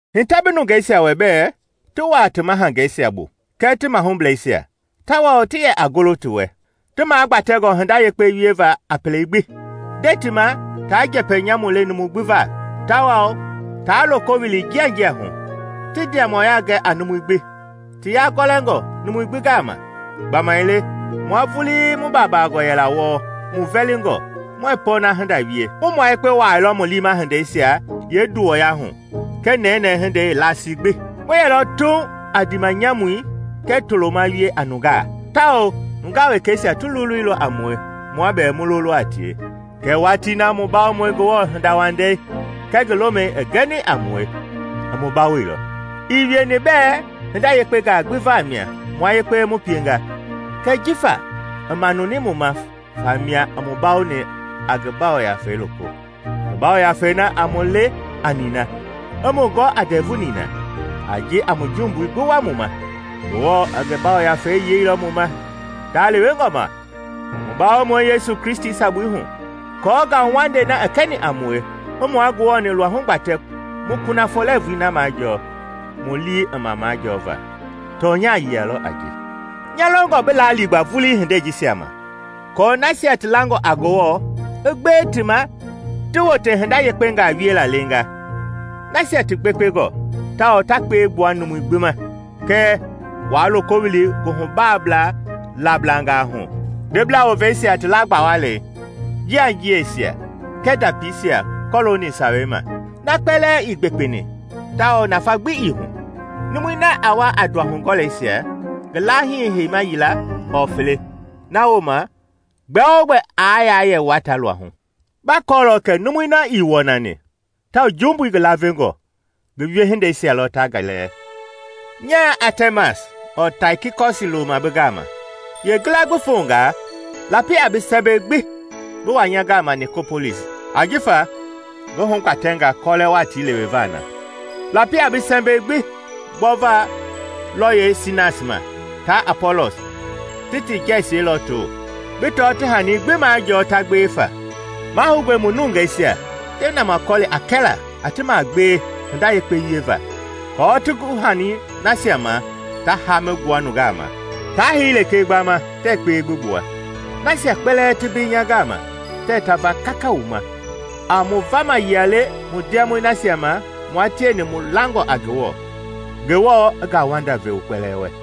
Hitɛ bi nungeisia wɛ bɛɛ ti wuaa ti mahangeisia bu kɛɛ ti mahublɛisia, tawao ti yɛ a golo ti wɛ, ti magbatɛngɔ hinda yekpe wieva a pele gbi. Nde ti ma taa njɛpɛ nyamu le numu gbi va, tawao taa loko wili njianjia hu, i yɛla tawao ti ndiamɔya gɛ a numui gbi, ti yagɔlɛngɔ numui gbi gama. Gbamaile mua vulii mu baabangɔ yɛla wɔɔ, mu vɛlingɔ, muɛɛ pɔɔna hinda wie. Mu mua yekpe wuaailɔ mu liima hindeisia yeenduwɔya hu kɛɛ nɛnɛɛ hindei yeelasii gbi. Mu yɛlɔ tuuŋ a ndiimanyamui kɛɛ toloma wie a nungaa, tawao nungaa wekɛisia ti loleilɔ a mue, mua bɛɛ mu lolo a tie. Kɛɛ watii na mu Bawomɔi Ngewɔ hindawandei kɛɛ ngi lomɛi i gɛni a mue, i mu bawoilɔ. Ii wieni bɛɛ hinda yekpengaa gbi vamia mua yekpe mu pienga, kɛɛ jifa i manuni mu ma famia i mu bawoni a ngi Yafei loko, ngi Yafei na a mu le a nina i mu gɔ a ndɛvu nina a ji a mu jumbui gbi wua mu ma. Ngewɔ i ngi Yafei yeilɔ mu ma ndalewengɔ ma, mu Bawomɔi Yesu Kristi sabui hu, aako ngauwandei na i kɛni a mue i mua Ngewɔ-ni luahu gbatɛ mu kunafɔ lɛɛvui na majɔɔ mu lii i ma majɔɔva. Tɔnya yia lɔ a ji. Nya longɔ bi laa liigba vulii hindei jisia ma, aako nasia ti langɔ a Ngewɔ i gbewe ti ma ti wote hinda yekpengaa wiela leenga; nasia ti gbekpengɔ tawao ta kpewe gbua numui gbi ma. Kɛɛ waa loko wili nguhubaa laablangaa hu, ndebla woveisia ti laa gbawalɛi, njianjiɛisia kɛɛ ndapiisia kɔlooni Sawei ma. Na kpɛlɛɛ ii gbekpeni tawao nafa gbi ii hu. Numui na a wa a nduahugɔlɛisia, ngi laahii heima yila ɔɔ fele, na wooma gbɛ-o-gbɛ aa yɛ wuata luahu. Ba kɔɔlɔ kɛ numui na ii wɔnani tawao jumbui ngi lavengɔi, ngi wiehindeisia lɔ ta ngi lɛɛ. Nyaa Atɛmas ɔɔ Taikikɔsi looma bi gama, yeengila gbi fongaa, lapi a bi sɛmbɛi gbi bi wa nya gama Nikopolisi, ajifa ngi hugbatɛnga kɔlɛ watii leweva na. Lapi a bi sɛmbɛi gbi gbɔva lɔyɛi Sinas ma taa Apɔlɔs ti ti jɛsie lɔɔto, bi tɔ ti hanii gbi majɔɔ ta gbewe fa. Mahoungɔe mu nungeisia ti namakɔli a kɛlaa a ti magbewe hinda yekpe wieva, aako ti gu hanii nasia ma ta haami gbua nungaa ma, taa hei lekee gbama tɛɛ kpewe gbi gbua. Nasia kpɛlɛɛ ti mbei nya gama tɛɛ ta va kaka wu ma. A mu vama yia le mu ndiamɔi nasia ma mua tieni mu langɔ a Ngewɔ. Ngewɔ i ngauwanda ve wu kpɛlɛɛ wɛ.